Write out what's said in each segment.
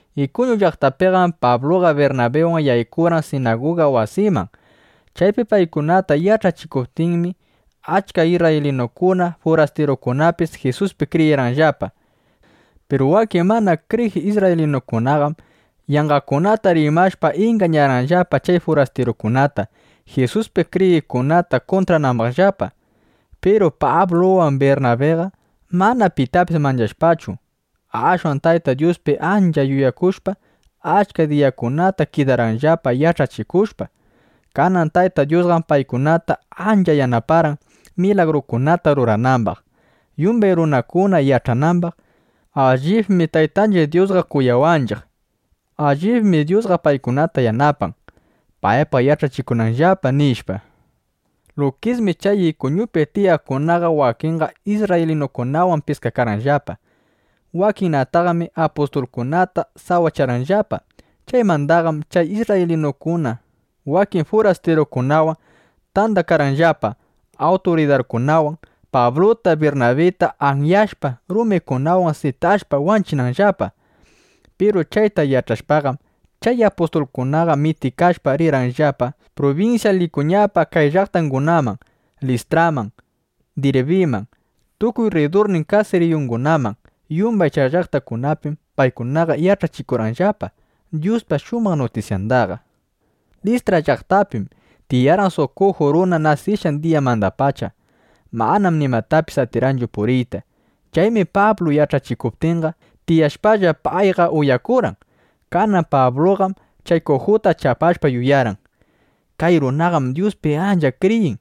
Ikuñu llaqtapiqam Pabluqa Birnabiwan yaykurqan sinaguga wasiman. Chaypi paykuna yach'achikuptinmi, achka isrraylinukuna, furastirukunapis Jisuspi kriyirqanllapa. Piru wakin mana kriyiq isrraylinukunaqam yanqakunata rimashpa, ingañarqanllapa chay furastirukunata, Jisuspi kriyiqkunata kuntranambaqllapa. Piru Pabluwan Birnabiqam mana pitapis manchashpachu, ashwan Tayta Dyuspi allita yuyakushpa, achka diyakunata kidarqanllapa yach'achikushpa. Kanan Tayta Dyusqam paykunata ancha yanaparqan, milagrukunata ruranambaq, yumbay runakuna yach'anambaq: Allibmi Taytanchiq Dyusqa kuyawanchiq. Allibmi Dyusqa paykunata yanapan, paypaq yach'achikunanllapa, nishpa. Lukismi chay Ikuñupi tiyaqkunaqa wakinqa isrraylinukunawan piskakarqanllapa. Wakinnataqmi apustulkunata sawacharqanllapa. Chaymandaqam chay isrraylinukuna wakin furastirukunawan tandakarqanllapa awturidarkunawan, Pabluta, Birnabita anyashpa, rumikunawan sitashpa wanchinanllapa. Piru chayta yach'ashpaqam, chay apustulkunaqa mitikashpa, rirqanllapa prubinsya Likuñapa kay llaqtangunaman: Listraman, Dirbiman, tukuy rridurnin kasiriyungunaman. Yumbay chay llaqtakunapim paykunaqa yach'achikurqanllapa Dyuspa shumaq nutisyanda. Listra llaqtapim tiyarqan suq kuju runa. Nasishqan diyamandapacham mana nimatapis atirqanchu puriyta. Chaymi Pablu yach'achikuptinqa, tiyashpalla payqa uyakuykarqan. Kanan Pabluqam chay kujuta chapashpa yuyarqan: Kay runaqam Dyuspi ancha kriyin.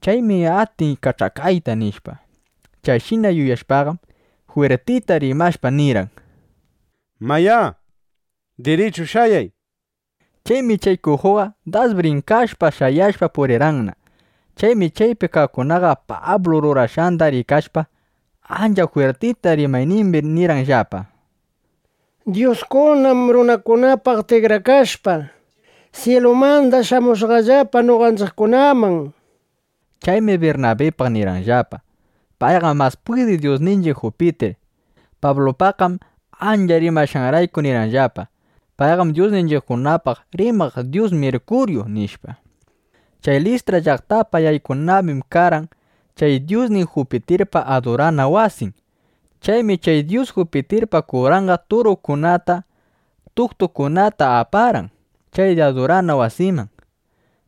Chaymi atin kach'akayta, nishpa. Chayshina yuyashpaqam, jwirtita rimashpa nirqan: —¡Mayá, dirichu shayay! nishpa. Chaymi chay kujuqa das brinkashpa, shayashpa, purirqanna. Chaymi chaypi kaqkunaqa Pablu rurashqanda rikashpa, ancha jwirtita rimaynimbi nirqanllapa: —Dyuskunam runakunapaq tikrakashpa, syilumanda shamushqallapa noqanchiqkunaman, nishpa. Chaymi Birnabipaq nirqanllapa: —Payqam mas pwidiq dyusninchiq Jupitir. Pablupaqqam, ancha rimashqanrayku, nirqanllapa: —Payqam dyusninchiqkunapaq rimaq dyus Mirkuryu, nishpa. Chay Listra llaqtapa yaykunambim karqan chay dyusnin Jupitirpa adurana wasin. Chaymi chay dyus Jupitirpa kuranqa turukunata, tuktukunata aparqan chay adurana wasiman,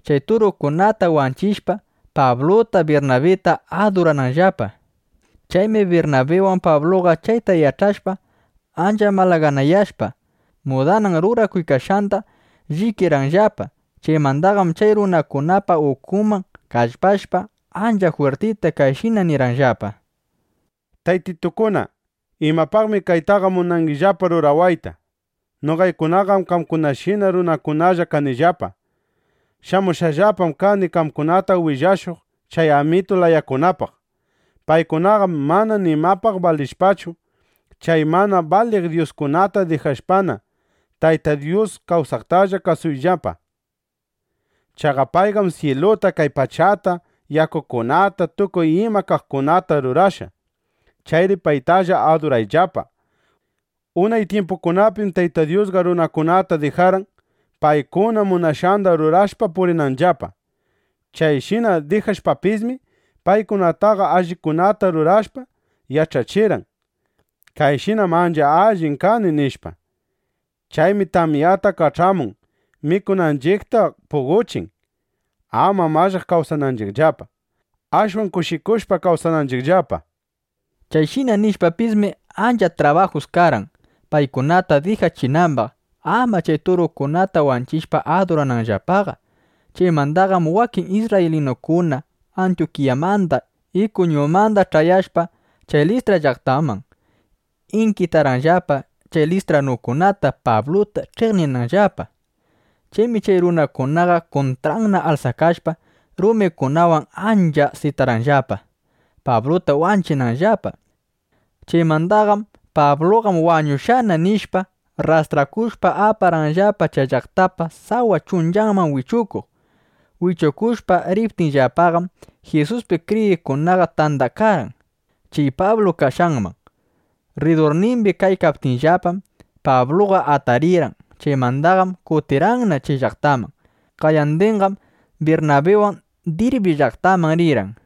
chay turukunata wanchishpa, Pabluta, Birnabita adurananllapa. Chaymi Birnabiwan Pabluqa chayta yach'ashpa, ancha malaganayashpa, mudanan rurakuykashqanda llikirqanllapa. Chaymandaqam chay runakunapa ukunman kallpashpa, ancha jwirtita kayshina nirqanllapa: —¡Taytitukuna, imapaqmi kaytaqa munangillapa rurawayta! Noqaykunaqam qamkunashina runakunalla kanillapa. Shamushqallapam kani qamkunata willashuq chay amitu layakunapaq. Paykunaqam mana nimapaq balinllapachu. Chay mana baliq dyuskunata dijashpana, Tayta Dyus kawsaqtalla kasuyllapa. Chaqa payqam syiluta, kay pachata, yakukunata, tukuy ima kaqkunata rurashqa. Chayri paytalla adurayllapa. Unay tyimpukunapim Tayta Dyusqa runakunata dijarqan, paykuna munashqanda rurashpa purinanllapa. Chayshina dijashpapismi, paykunataqa allikunata rurashpa, yach'achirqan: Kayshinam ancha allin kani, nishpa. Chaymi tamyata kach'amun; mikunanchiqta puqochin, ama mallaq kawsananchiqllapa, ashwan kushikushpa, kawsananchiqllapa, nishpa. Chayshina nishpapismi, ancha trabajus karqan, paykunata dijachinambaq, ama chay turukunata wanchishpa adurananllapaqa. Chaymandaqam wakin isrraylinukuna Antyukiyamanda, Ikuñumanda ch'ayashpa chay Listra llaqtaman, inkitarqanllapa chay listranukunata, Pabluta ch'iqninanllapa. Chaymi chay runakunaqa kuntranna alsakashpa, rumikunawan ancha sitarqanllapa, Pabluta wanchinanllapa. Chaymandaqam “Pabluqam wañushqana” nishpa, rrastrakushpa, aparqanllapa chay llaqtapa sawa chunchanman wichukuq. Wichukushpa riptinllapaqam, Jisuspi kriyiqkunaqa tandakarqan chay Pablu kashqanman. Rridurnimbi kaykaptinllapam, Pabluqa atarirqan. Chaymandaqam kutirqanna chay llaqtaman. Qayandinqam Birnabiwan Dirbi llaqtaman rirqan.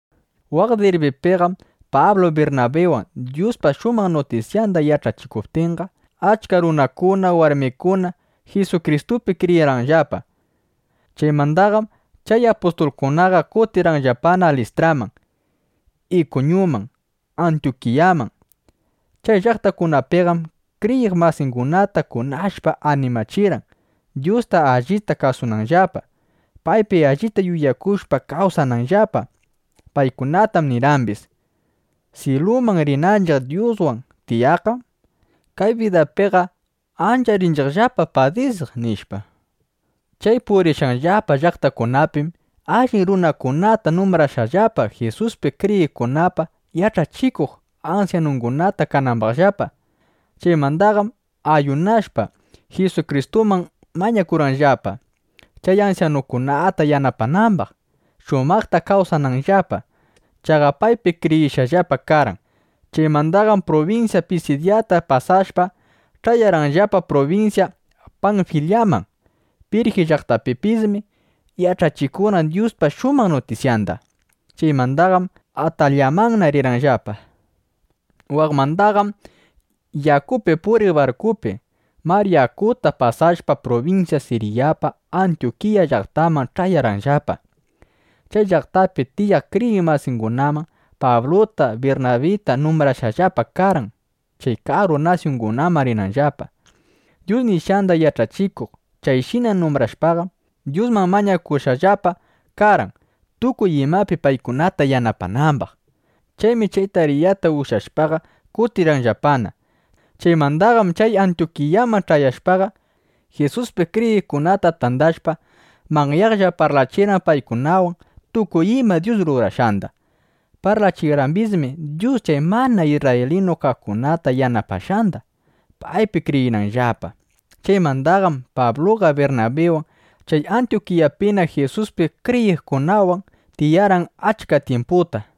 Waq Dirbipiqam Pablu Birnabiwan Dyuspa shumaq nutisyanda yach'achikuptinqa, achka runakuna, warmikuna Jisukristupi kriyirqanllapa. Chaymandaqam chay apustulkunaqa kutirqanllapa Listraman, Ikuñuman, Antyukiyaman. Chay llaqtakunapiqam kriyiq masingunata kunashpa animachirqan, Dyusta allita kasunanllapa, paypi allita yuyakushpa kawsananllapa. Paykunatam nirqambis: —Syiluman rinanchiq Dyuswan tiyaqqam, kay bidapiqa ancha rinchiqllapa padisiq, nishpa. Chay purishqanllapa llaqtakunapim allin runakunata numbrarqanllapa, Jisuspi kriyiqkunapa yach'achikuq ansyanunguna kanambaqllapa. Chaymandaqam ayunashpa, Jisukristuman mañakurqanllapa, chay ansyanukunata yanapanambaq, shumaqta kawsananllapa. Chaqa paypi kriyishqallapa karqan. Chaymandaqam prubinsya Pisidyata pasashpa, ch'ayarqanllapa prubinsya Panfilyaman. Pirji llaqtapipismi yach'achikurqan Dyuspa shumaq nutisyanda. Chaymandaqam Atalyamanna rirqanllapa. Waqmandaqam yakupi puriq barkupi mar yakuta pasashpa, prubinsya Siryapa Antyukiya llaqtanman ch'ayarqanllapa. Chay llaqtapi tiyaq kriyiq masingunam Pabluta, Birnabita numbrashqallapa karqan, chay karu nasyungunaman rinanllapa, Dyus nishqanda yach'achikuq. Chayshina numbrashpaqam, Dyusman mañakushqallapa karqan, tukuy imapi paykunata yanapanambaq. Chaymi chay tariyata ushyashpaqa kutirqanllapana. Chaymandaqam chay Antyukiyaman ch'ayashpaqa, Jisuspi kriyiqkunata tandashpa, manyaqlla parlachirqan paykunawan tukuy ima Dyus rurashqanda. Parlachirqambismi Dyus chay mana isrraylinu kaqkunata yanapashqanda, paypi kriyinanllapa. Chaymandaqam Pabluqa Birnabiwan chay Antyukiyapina Jisuspi kriyiqkunawan tiyarqan achka tyimputa.